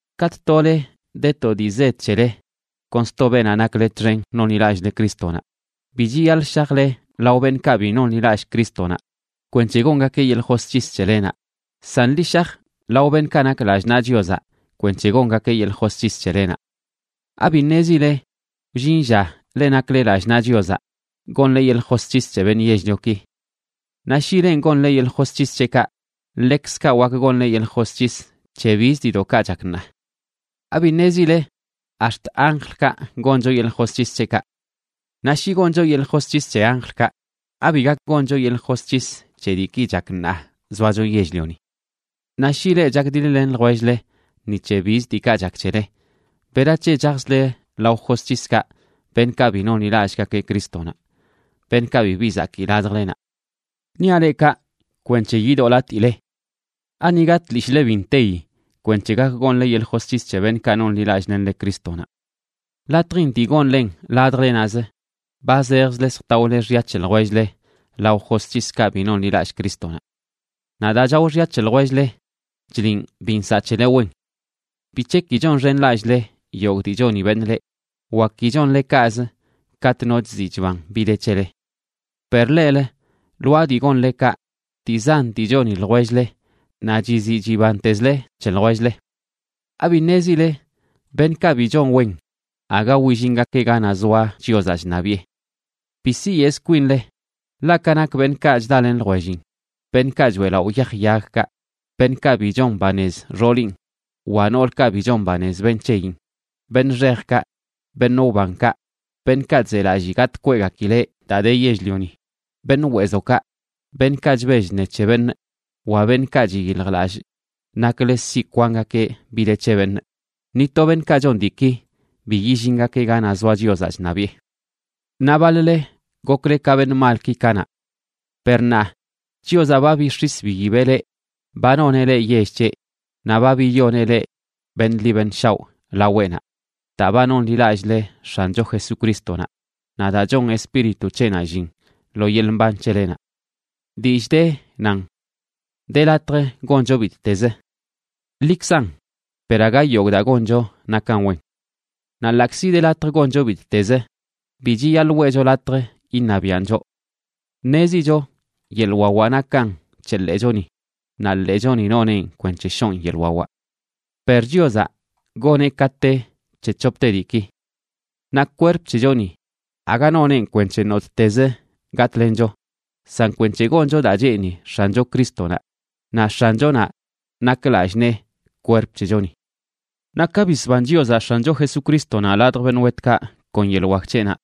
Katꞌ tole de to dii zed c̱hele kon sto beenaꞌ nakle txen nonḻilallꞌle Crístonaꞌ, bi chiyaḻꞌ shajle lao beṉꞌkaꞌ bi nonḻilallꞌ Crístonaꞌ kwenc̱he gongakeꞌ yeḻꞌ josc̱his c̱helenaꞌ, san ḻi shaj lao beṉꞌkaꞌ nak lallꞌ naꞌ Chiozaꞌ kwenc̱he gongakeꞌ yeḻꞌ josc̱his c̱helenaꞌ. ¿Abi ṉezile wllin lla leꞌ nakle lallꞌ naꞌ Chiozaꞌ gonle yeḻꞌ josc̱his c̱he beṉꞌ yell-lioki? Naꞌ shi lenꞌ gonle yeḻꞌ josc̱his c̱heꞌkaꞌ, ḻekzkaꞌ wak gonle yeḻꞌ josc̱his c̱he bizə diidoꞌkaꞌ chak ṉaa. ¿Abi ṉezile ax̱t anjlkaꞌ goncho yeḻꞌ josc̱his c̱heꞌkaꞌ? Naꞌ shi goncho yeḻꞌ josc̱his c̱he anjlkaꞌ, ¿abi gak goncho yeḻꞌ josc̱his c̱he diiki chak ṉaa zoacho yell-lioni? Naꞌ shi leꞌ chakdiḻ-len ljwell-le ni c̱he biz diikaꞌ chak c̱hele, ¿berac̱he chajzle lao josc̱hiskaꞌ beṉꞌkaꞌ bi nonḻilallꞌgakeꞌ Crístonaꞌ, beṉꞌkaꞌ bibi zakii ladjlenaꞌ? Niaꞌ leꞌ kaꞌ kwenc̱he yidoꞌlatile. ¿Aniga tlishꞌle bi nteyi kwenc̱he gak gonle yeḻꞌ josc̱his c̱he beṉꞌkaꞌ nonḻilallꞌlenle Crístonaꞌ? Latjin dii gonlen ladjle naꞌz, ba zejzle zjtaole xya c̱he ljwell-le lao josc̱hiskaꞌ bi nonḻilallꞌ Crístonaꞌ. Naꞌ daa chao xya c̱he ljwell-le chliꞌn bi nsaꞌ c̱hele wen. ¿Bic̱he ki chonxenlallꞌle yogꞌ dii choni beṉꞌ leꞌ, wa ki chonle kaꞌz katꞌ no chziꞌ chban bi de c̱hele? Per leꞌlə, lwaa dii gonle kaꞌ, dii zan dii choni ljwell-le naꞌ chiziꞌ chibantezle c̱he ljwell-le. ¿Abi ṉezile beṉꞌkaꞌ bi chon wen aga willingakeꞌ ganaꞌ zoa Chiozaꞌ chṉabiꞌe? Bi siyeꞌz kwinle, ḻaꞌ ka nak beṉꞌkaꞌ chdalen ljwellin, beṉꞌkaꞌ choeꞌlaꞌo yaj yagkaꞌ, beṉꞌkaꞌ bi chon banez xoolin wa noolkaꞌ bi chon banez beṉꞌ c̱heyin, beṉꞌ xejkaꞌ, beṉꞌ wbankaꞌ, beṉꞌkaꞌ chzelallii gatꞌ kweꞌgakileꞌ daa de yell-lioni, beṉꞌ weezokaꞌ, beṉꞌkaꞌ chbell chṉe c̱he beṉꞌ, wa beṉꞌkaꞌ chyiljlallꞌ naklə siꞌ kwangakeꞌ bi de c̱he beṉꞌ, ni to beṉꞌkaꞌ chon diiki bi yillingakeꞌ ganaꞌ zoa Chiozaꞌ chṉabiꞌe. Naꞌ baḻ-le gokle ka beṉꞌ malki kanaꞌ. Per ṉaa Chiozaꞌ ba bix̱is biyibeꞌ leꞌ, ba noneꞌ leꞌ yell c̱heꞌ, naꞌ ba biyoneꞌ leꞌ beṉꞌ ḻi beṉꞌ shaoꞌ laweꞌnaꞌ daa ba nonḻilallꞌle X̱ancho Jesucrístonaꞌ naꞌ daa chon Espíritu c̱heꞌnaꞌ llin lo yeḻꞌ mban c̱helenaꞌ. Dillꞌ de, nan: “De latj goncho bittezə.” Ḻikzan, per aga yogꞌ daa goncho nakan wen. Naꞌ ḻaꞌkzi de latj goncho bittezə, bi chiyaḻꞌ weꞌcho latj iṉabiaꞌn choꞌ. Ṉezicho yeḻꞌ wawaꞌ nakan c̱he ḻeechoni, naꞌ ḻeechoni noneꞌn kwenc̱he shoon yeḻꞌ wawaꞌ. Per Chiozaꞌ goneꞌ ka te c̱he c̱hopte diiki. Naꞌ kwerp c̱hechoni aga noneꞌn kwenc̱he nottez gatꞌlencho, san kwenc̱he goncho daa cheeni X̱ancho Crístonaꞌ, naꞌ X̱anchonaꞌ nak lallꞌ nee kwerp c̱hechoni. Naꞌ ka bisban Chiozaꞌ X̱ancho Jesucrístonaꞌ ladj beṉꞌ wetkaꞌ kon yeḻꞌ wak c̱heꞌnaꞌ,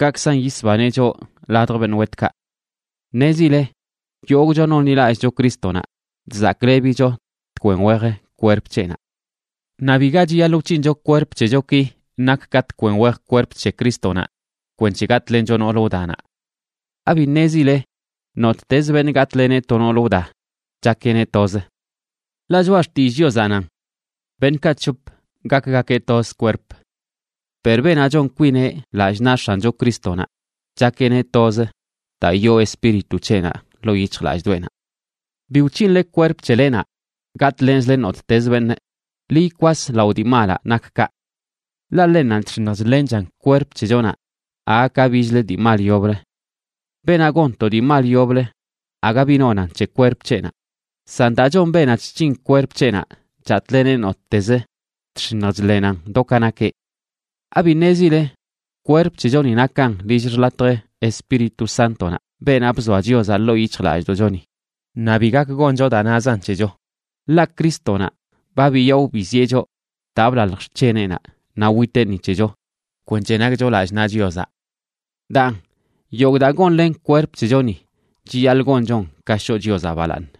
kaꞌkzan yisbaneꞌ choꞌ ladj beṉꞌ wetkaꞌ. Ṉezile yogꞌcho nonḻilallꞌcho Crístonaꞌ chzaklebicho tkwen wej kwerp c̱heꞌnaꞌ. Naꞌ biga chiyaḻꞌ wc̱hincho kwerp c̱hechoki nak ka tkwen wej kwerp c̱he Crístonaꞌ kwenc̱he gatꞌlencho noolə wdanaꞌ. ¿Abi ṉezile nottezə beṉꞌ gatꞌleneꞌ to noolə wda, chakeꞌneꞌ toz? Ḻaꞌ Choꞌa Xtillꞌ Chiozaꞌ nan: “Beṉꞌkaꞌ c̱hop gakgakeꞌ toz kwerp.” Per beenaꞌ chon kwineꞌ lallꞌ naꞌ X̱ancho Crístonaꞌ, chakeꞌneꞌ toz daa yoo Espíritu c̱heꞌnaꞌ ḻoo yic̱hjlallꞌdoꞌenaꞌ. Bi wc̱hinle kwerp c̱helenaꞌ gatꞌlenzle nottez beṉꞌ, ḻi ikwas lao dii malaꞌ nak kaꞌ. Ḻaꞌ ḻennanꞌ chx̱iṉj chḻenchan kwerp c̱hechonaꞌ aga ka bichlə dii mal yoblə. Beenaꞌ gon to dii mal yoblə, aga bi nonan c̱he kwerp c̱heꞌnaꞌ, san daa chon beenaꞌ chc̱hin kwerp c̱heꞌnaꞌ chatꞌleneꞌ nottez, chx̱iṉj chḻenan do ka nakeꞌ. ¿Abi ṉezile kwerp c̱hechoni nakan lill xḻatj Espíritu Sántonaꞌ, beenaꞌ bzoa Chiozaꞌ ḻoo yic̱hjlallꞌdoꞌchoni? Naꞌ bi gak goncho daa nazan c̱hecho; ḻaꞌ Crístonaꞌ ba biyaꞌo biziꞌe choꞌ daa blalj xc̱heneꞌnaꞌ naꞌ witeꞌ ni c̱hecho kwenc̱he nakcho lallꞌ naꞌ Chiozaꞌ. Daan yogꞌ daa gonlen kwerp c̱hechoni chiyaḻꞌ gonchon ka shoꞌ Chiozaꞌ balaaṉ.